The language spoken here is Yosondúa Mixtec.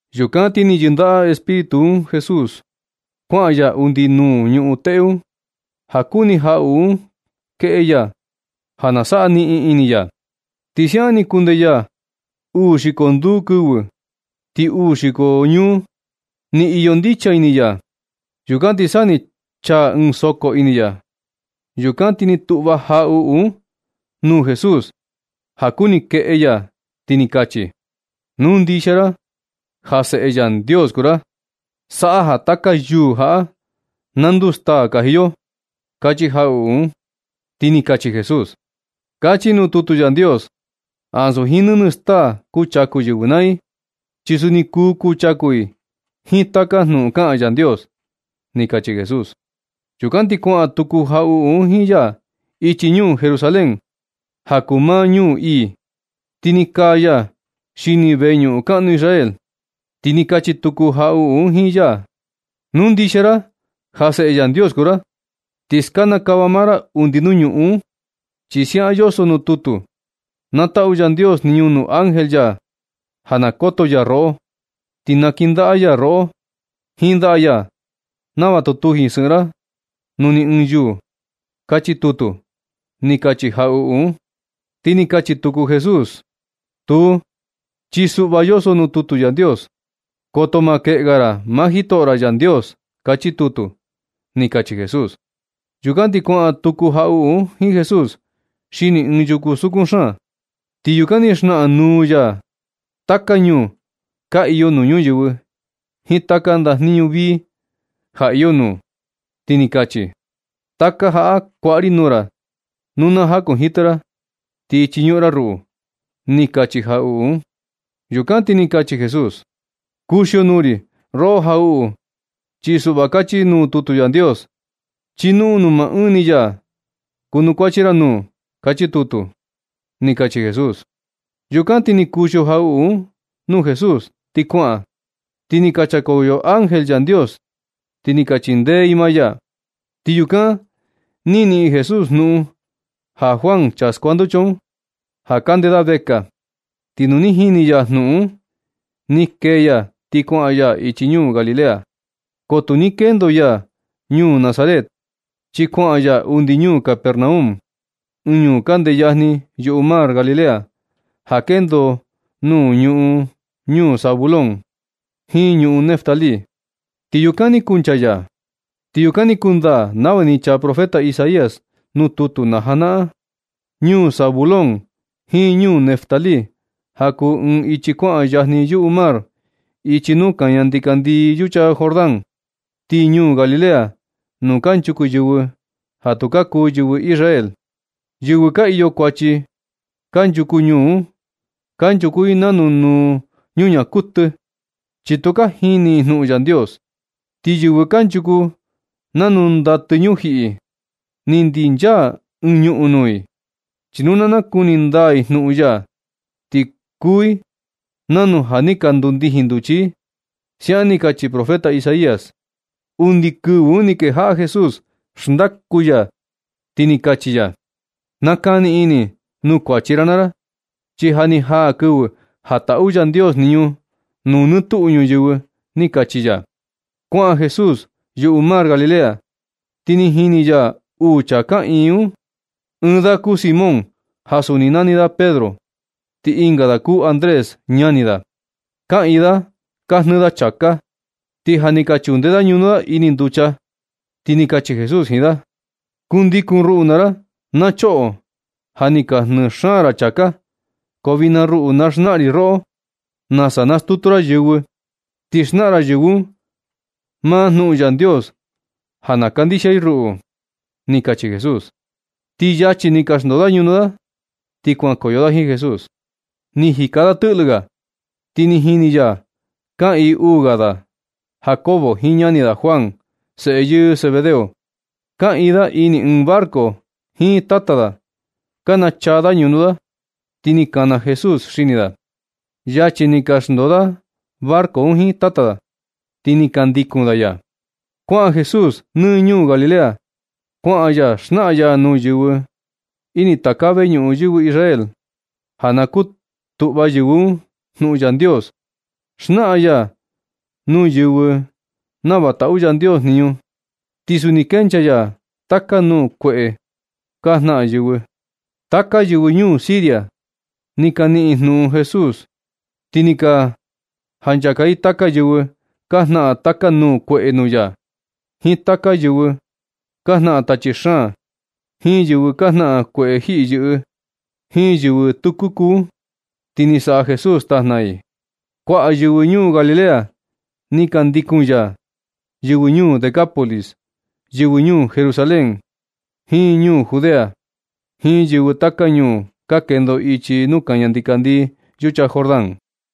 Yukan ti ni yɨndaꞌa Espíritu un Jesús kuaꞌan ya undi nuu ñuꞌun teꞌe un, ja kuni jaꞌuꞌu un kueꞌe ya ja na saꞌa niꞌin ini ya. Ti siaꞌan ni kundee ya uu xiko nduu kɨvɨ, ti uu xiko jakuaa, ni iyo ndicha ini ya. Yukan ti sa ni chaa ɨɨn soko ini ya. Yukan ti ni tuꞌva jaꞌuꞌu un nuu Jesús ja kuni keꞌe ya, ti ni kachi: ―Nu ndixia ra ja Seꞌe Yandios kuu ra, saꞌa ja taka yuū jaꞌa na nduu staa kaji yo ―kachi jaꞌuꞌu un. Ti ni kachi Jesús: ―Kachi nuu tutu Yandios: “Ansu jiin nɨnɨ staa kuchaku yɨvɨ naa i, chi suni kuu kuchaku i jiin taka jnuꞌun kaꞌan Yandios”, ―ni kachi Jesús. Yukan ti kuaꞌan tuku jaꞌuꞌu un jiin ya ichi ñuu Jerusalén, ja kuu maa ñuu ii, ti ni kaa ya xini veñuꞌun kaꞌnu Israel, ti ni kachi tuku jaꞌuꞌu un jiin ya: ―Nu ndixia ra ja Seꞌe Yandios kuu ra, ti skanakava maa ra undi nuu ñuꞌun un, chi siaꞌan yoso nuu tutu: Na taꞌu Yandios jniñu nuu ángel ya ja na koto ya roꞌo. Ti nakindaꞌa ya roꞌo jiin ndaꞌa ya, nava tu tuji sɨꞌɨn ra nuu ni ɨɨn yuu. Kachi tutu, ni kachi jaꞌuꞌu un. Ti ni kachi tuku Jesús: ―Tuu, chi suꞌva yoso nuu tutu Yandios: “Koto maa keꞌe ga ra maa jitoꞌo ra Yandios”, kachi tutu ―ni kachi Jesús. Yukan ti kuaꞌan tuku jaꞌuꞌu un jiin Jesús xini ɨɨn yuku sukun xaan, ti yukan ni xnaꞌan nuu ya taka ñuu ka iyo nuu ñuyɨvɨ jiin taka ndajniñu vii ja iyo nuu, ti ni kachi: ―Taka jaꞌa kuaꞌa ri nuu ra nu na jakunjitɨ ra ti chiñuꞌun ra ruꞌu ―ni kachi jaꞌuꞌu un. Yukan na ti ni kachi Jesús: ―Kuxio nuu ri roꞌo jaꞌuꞌu, chi suꞌva kachi nuu tutu Yandios: “Chiñuꞌun nuu maa ɨɨn ni ya kunukuachi ra nuu”, kachi tutu ―ni kachi Jesús. Yukan ti ni kuxio jaꞌuꞌu un nuu Jesús ti kuaꞌan. Ti sa ni ka chakoyo ángel Yandios, ti ni ka chindee i maa ya. Ti yukan ni niꞌin Jesús jnuꞌun Juan, chaa skuanducha un, ja kande da vekaa. Ti nu ni jini ya jnuꞌun un, ni kee ya ti kuaꞌan ya ichi ñuu Galilea. Ko tu ni kendo ya ñuu Nazaret, chi kuaꞌan ya undi ñuu Capernaum, ɨɨn ñuu kande yajni yuꞌu mar Galilea, ja kendo nuu ñuꞌun ñuu Zabulón jiin ñuꞌun Neftalí, ti yukan ni kuncha ya. Ti yukan ni kundaa nava ni chaa profeta Isaías nuu tutu na janaꞌan: Ñuu Zabulón jiin ñuu Neftalí, ja kuu ɨɨn ichi kuaꞌan yajni yuꞌu mar, ichi nuu kaña ndikandii yucha Jordán, ti ñuu Galilea nuu kanchuku yɨvɨ ja tu ka kuu yɨvɨ Israel. Yɨvɨ ka iyo kuachi kanchuku ñuu un, kanchuku i nanu nuu ñuñaa kuɨtɨ, chi tu ka jini i jnuꞌun Yandios. Ti yɨvɨ kanchuku nanu ndatɨ ñujiꞌi, ni ndinchaa ɨɨn ñuꞌun nuu i. Chi nu na nakuni ndaa i jnuꞌun ya, ti kuu i nanu ja ni ka ndundijin nduchi i. Siaꞌan ni kachi profeta Isaías. Undi kɨvɨ un ni kejaꞌa Jesús xndaku ya, ti kachi ya: ―Nakani ini nuu kuachi ra naa ra, chi ja ni jaa kɨvɨ ja taꞌu Yandios jniñu nuu nɨ tuꞌu ñuyɨvɨ ―ni kachi ya. Kuaꞌan Jesús yuꞌu mar Galilea, ti ni jini ya uu chaa kaꞌiin un, ɨɨn da kuu Simón ja suni nani da Pedro, ti ɨnga da kuu Andrés, ñani da. Kaꞌiin da ka jnɨɨ da chāká, ti ja ni ka chunde da ñunu da ini nducha, ti ni kachi Jesús jiin da: ―Kundikun ruꞌu naa ra, na choꞌo. Ja ni ka jnɨɨ xaan ra chāká, ko vijna ruꞌu, na xnaꞌan ri roꞌo nasa nastutu ra yɨvɨ. Ti xnaꞌan ra yɨvɨ un maa jnuꞌun Yandios ja na kandixia i ruꞌu ―ni kachi Jesús. Ti luego ni, ni ka xndoo da ñunu da ti kuankoyo da jiin Jesús. Ni jika ya tɨꞌlɨ ga, ti ni jini ya kaꞌiin uu ga da, Jacobo jiin ñani da Juan, seꞌe yɨɨ Zebedeo. Kaꞌiin da ini ɨɨn barco jiin tata da, ka nachaa da ñunu da, ti ni kana Jesús xini da. Yachi ni, ni ka xndoo da barco un jiin tata da, ti ni ka ndikun da ya. Kuaꞌan Jesús nɨ ñuu Galilea, kuaꞌan ya xnaꞌan ya nuu yɨvɨ ini taka veñuꞌun yɨvɨ Israel ja na kutuꞌva yɨvɨ un jnuꞌun Yandios. Xnaꞌan ya nuu yɨvɨ nava taꞌu Yandios jniñu, ti suni kenchaa ya taka nuu kueꞌe ka jnaꞌan yɨvɨ. Taka yɨvɨ ñuu Siria ni ka niꞌin i jnuꞌun Jesús, ti ni ka janchaka i taka yɨvɨ ka jnaꞌan taka nuu kueꞌe nuu ya, jiin taka yɨvɨ ka jnaꞌan tachi xaan, jiin yɨvɨ ka jnaꞌan kueꞌe jiyɨꞌɨ, jiin yɨvɨ tɨkuku un. Ti ni saꞌa Jesús tajna i. Kuaꞌa yɨvɨ ñuu Galilea ni ka ndikun ya, yɨvɨ ñuu Decápolis, yɨvɨ ñuu Jerusalén, jiin ñuu Judea, jiin yɨvɨ taka ñuu ka kendo ichi nuu kaña ndikandii yucha Jordán.